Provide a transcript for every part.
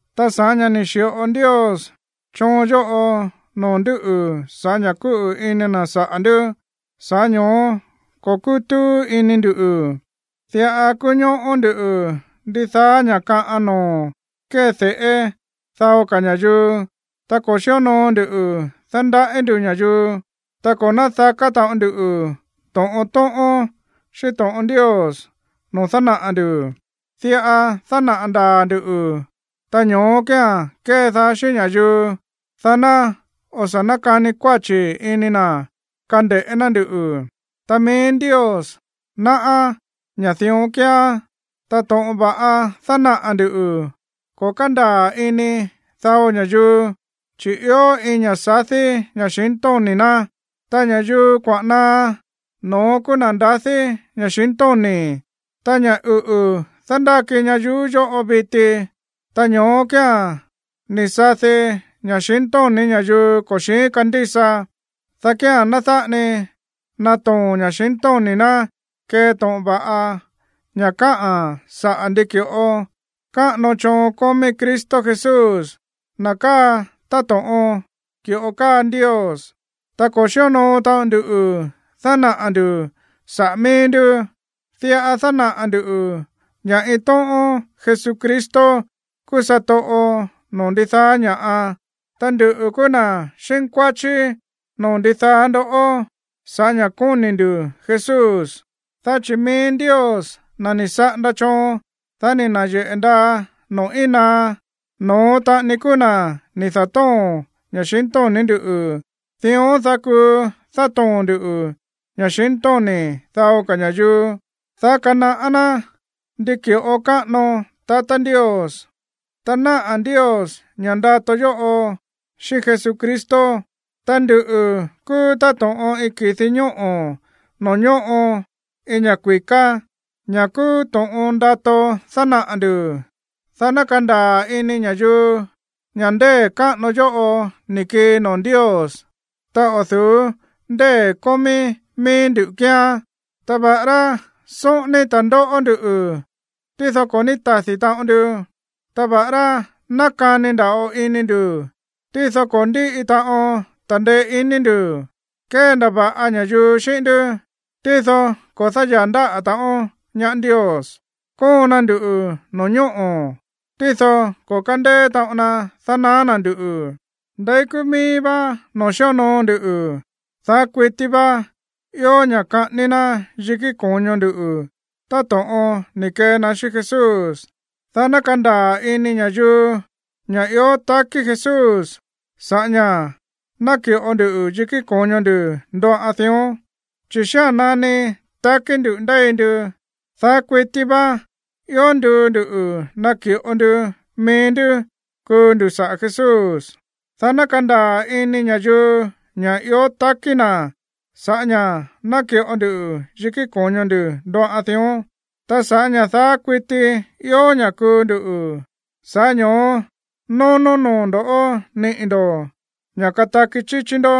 Ta sa̱ꞌá ña̱ ni̱ xi̱ꞌo Ndios choon yóꞌo noo̱ ndú sa̱ꞌá ña̱ kúꞌu̱ ini na̱ saꞌa̱ ndú, sa̱ꞌá ño̱ó ko̱ kútúú ini ndu̱. Diꞌa kúñóꞌó ndú ndidaá ña̱ kaꞌan noo̱ kéde̱ꞌé dao ka̱ ña̱yuu. Ta ko̱ xíonoo ndu dándaꞌí ndu̱ ña̱yuu, ta ko̱ nádaká taꞌon ndu to̱ꞌon tóꞌón xíꞌín to̱ꞌon Ndios noo̱ dánaꞌa̱ ndu̱. Diꞌa dánaꞌa̱ ndaa̱ ndu̱, ta ño̱ó kía̱n kédaá xíꞌín ña̱yuu, dá ná o̱ sa̱ nákani kuáchi̱ ini na̱ kande̱ꞌé ná nduꞌu̱. Ta mií Ndios náꞌá ña̱ dión kíán. Ta to̱ꞌon va̱ꞌa dánaꞌa̱ ndu̱, ko̱ kándaa̱ ini dao ña̱yuu, chi̱ ió iin ña̱ꞌa sadí ña̱xintóni̱ ná. Ta ña̱yuu kuaꞌa̱n naá, no̱ón kúú na̱ ndadí ña̱xintóni̱. Ta ña̱ uꞌu̱ dándáki ñayuú yóꞌo viti, ta ño̱ó kía̱n ni̱ sadi ña̱xintóni̱ ña̱yuu ko̱ xi̱ín kandísa, dá kía̱n ná dáꞌa ni natoo̱n ña̱xintóni̱ ná kee to̱ꞌon va̱ꞌa ña̱ káꞌa̱n saꞌa̱ ndi ki̱ꞌo káꞌano choon kómí Cristo Jesús, na̱ káa táto̱ꞌon ki̱ꞌo káa Ndios. Ta ko̱ xíonoo taꞌon nduꞌu̱ dánaꞌa̱ ndu̱ saꞌa̱ míí ndú, diꞌa dánaꞌa̱ ndu̱ ña̱ iin tóꞌón Jesucristo kúú satoꞌo noo̱ ndidaá ña̱ꞌa, ta nduꞌu̱ kúú na̱ xínkuáchí noo̱ ndidaá ndó sa̱ꞌá ña̱ kóni̱ ndu̱ Jesús. Dá chi̱ mií Ndios, na̱ ni̱ saꞌanda choon, dá ni̱ na̱yeꞌe̱ ndaa noo̱ íin naá, no̱ón taꞌani kúú na̱ ni̱ da̱tóo̱n ña̱xintóni̱ ndú, dión dá kuu dátoo̱n ndu̱ ña̱xintóni̱ dao ka̱ ña̱yuu, dá kanaꞌá ná ndi ki̱ꞌo káꞌano tatá Ndios, ta náꞌa̱ Ndios ña̱ ndato yóꞌo xíꞌín Jesucristo. Ta nduꞌu̱ kúú táto̱ꞌon iin ki̱di ñóꞌo̱ noo̱ ñóꞌo iin ña̱ kui̱ká, ña̱ kúú to̱ꞌon ndato dánaꞌa̱ ndu̱, dá ná kandaa̱ ini ña̱yuu ña̱ ndée̱ káꞌano yóꞌo ni̱ kii noo̱ Ndios, ta o̱ du̱ú ndée̱ kómí míí ndú kíán. Ta va̱ꞌará sóꞌóní ta̱ndóꞌó nduꞌu̱, tído ko̱ ní tadi̱ taꞌon ndu. Ta va̱ꞌará nákani nda̱ꞌo ini ndu̱, tído ko̱ ndíꞌi taꞌon ta̱ndeé iní ndu̱. Kéndava̱ꞌa ña̱yuu xíꞌín ndú, tído ko̱ dáyaa̱ ndáꞌa̱ taꞌon ñaá Ndios. Kóon na nduꞌu̱ no̱ñóꞌo̱, tído ko̱ kándeé taꞌon na dánaá na̱ nduꞌu̱. Ndeí kúú míí vá noo̱ xíonoo ndu, daá kuití vá ió ña̱ kaꞌání ná yikí ko̱ño ndu̱ táto̱ꞌon ni̱ kee na xíꞌín Jesús, dá ná kandaa̱ ini ña̱yuu ña̱ ió takí Jesús sa̱ꞌá ña̱ náki̱ꞌo ndu yikí ko̱ño ndu̱ ndoꞌan dión. Chi̱ xía̱n nani takí ndu̱ ndéi ndu, daá kuití vá ió nduu ndu̱ naki̱ꞌo ndu mií ndú kuu ndu̱ saꞌa̱ Jesús, dá ná kandaa̱ ini ña̱yuu ña̱ ió takí na̱ sa̱ꞌá ña̱ náki̱ꞌo ndu yikí ko̱ño ndu̱ ndoꞌan dión. Ta sa̱ꞌá ña̱ daá kuití ió ña̱ kuu ndu̱, sa̱ꞌá ño̱ó nónó noo̱ ndo̱ niꞌi̱ ndo̱ ña̱ kataki chíchí ndó.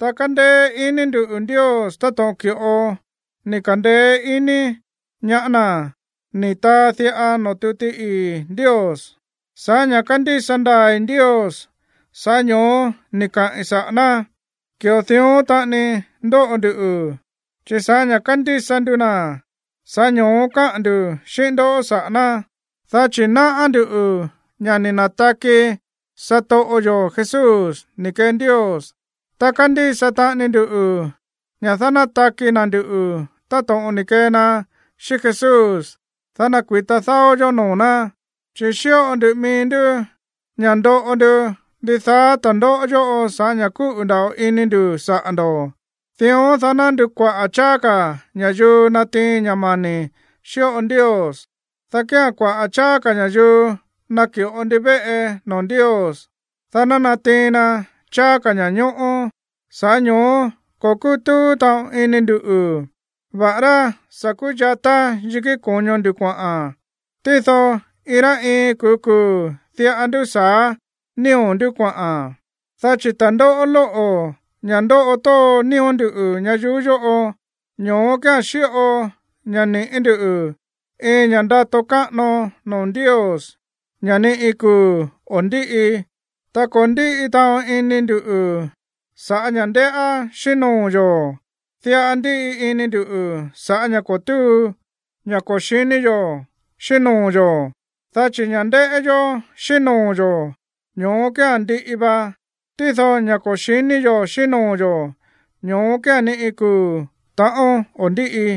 Ta kándéé iní ndu̱ Ndios táto̱ꞌon ki̱ꞌo ni̱ ka̱ndeé ini ñaá na̱ ni̱ taa diꞌa noo̱ tuti ii̱ Ndios: “Sa̱ꞌá ña̱ kándísa ndaa̱i̱ Ndios, sa̱ꞌá ño̱ó ni̱ kaꞌi̱n saꞌa̱ ná.” Ki̱ꞌo dión taꞌani ndóꞌo nduꞌu̱, chi̱ sa̱ꞌá ña̱ kándísa ndu na̱, sa̱ꞌá ño̱ó káꞌa̱n ndu̱ xíꞌín ndó saꞌa̱ ná, dá chi̱ náꞌá ndú ña̱ ni̱ na̱taki satoꞌo yo̱ Jesús ni̱ kee Ndios, ta kándísa taꞌani ndu ña̱ dánátaki na̱ nduꞌu̱ táto̱ꞌon ni̱ kee na xíꞌín Jesús, dá nakui̱ta dáó yó noo̱ ná. Chi̱ xíꞌo ndu mií ndú ña̱ ndóꞌo ndu ndidaá ta̱ndóꞌó yóꞌo sa̱ꞌá ña̱ kúꞌu̱ nda̱ꞌo ini ndu̱ saꞌa̱ ndo̱, dión, dá ná ndukuaꞌa̱ cháá ka̱ ña̱yuu natiin ña̱ mani̱ xíꞌo Ndios, dá kía̱n kuaꞌa̱ cháá ka̱ ña̱yuu naki̱ꞌo ndivéꞌe noo̱ Ndios, dá ná natiin na cháá ka̱ ña̱ñóꞌó. Sa̱ꞌá ño̱ó ko̱ kútúú taꞌon ini ndu̱, va̱ꞌará sa̱ kúyatá yikí ko̱ño ndu̱ kuaꞌa̱n, tído iin rá iin kuu̱ kuu̱ diꞌa ndúsa̱á nío̱ ndú kuaꞌa̱n. Dá chi̱ ta̱ndóꞌó lóꞌo̱, ña̱ ndóꞌo tóo nío̱ ndú ñayuú yóꞌo, ño̱ó kía̱n xíꞌo ña̱ niꞌi̱ ndú iin ña̱ ndato káꞌano noo̱ Ndios, ña̱ ni iin kuu̱ o̱ ndíꞌi. Ta ko̱ ndíꞌi taꞌon ini ndu̱ sa̱ꞌá ña̱ ndéꞌá xíꞌín noo̱ yo̱. Diꞌa ndíꞌi ini ndu̱ sa̱ꞌá ña̱ ko̱ túu, ña̱ ko̱ xi̱ní yo̱ xíꞌín noo̱ yo̱. Dá chi̱ ña̱ ndéꞌé yó xíꞌín noo̱ yo̱, ño̱ó kía̱n ndiꞌi va. Tído ña̱ ko̱ xi̱ní yo̱ xíꞌín noo̱ yo̱, ño̱ó kía̱n ni iin kuu̱ ta̱ꞌón o̱ ndíꞌi.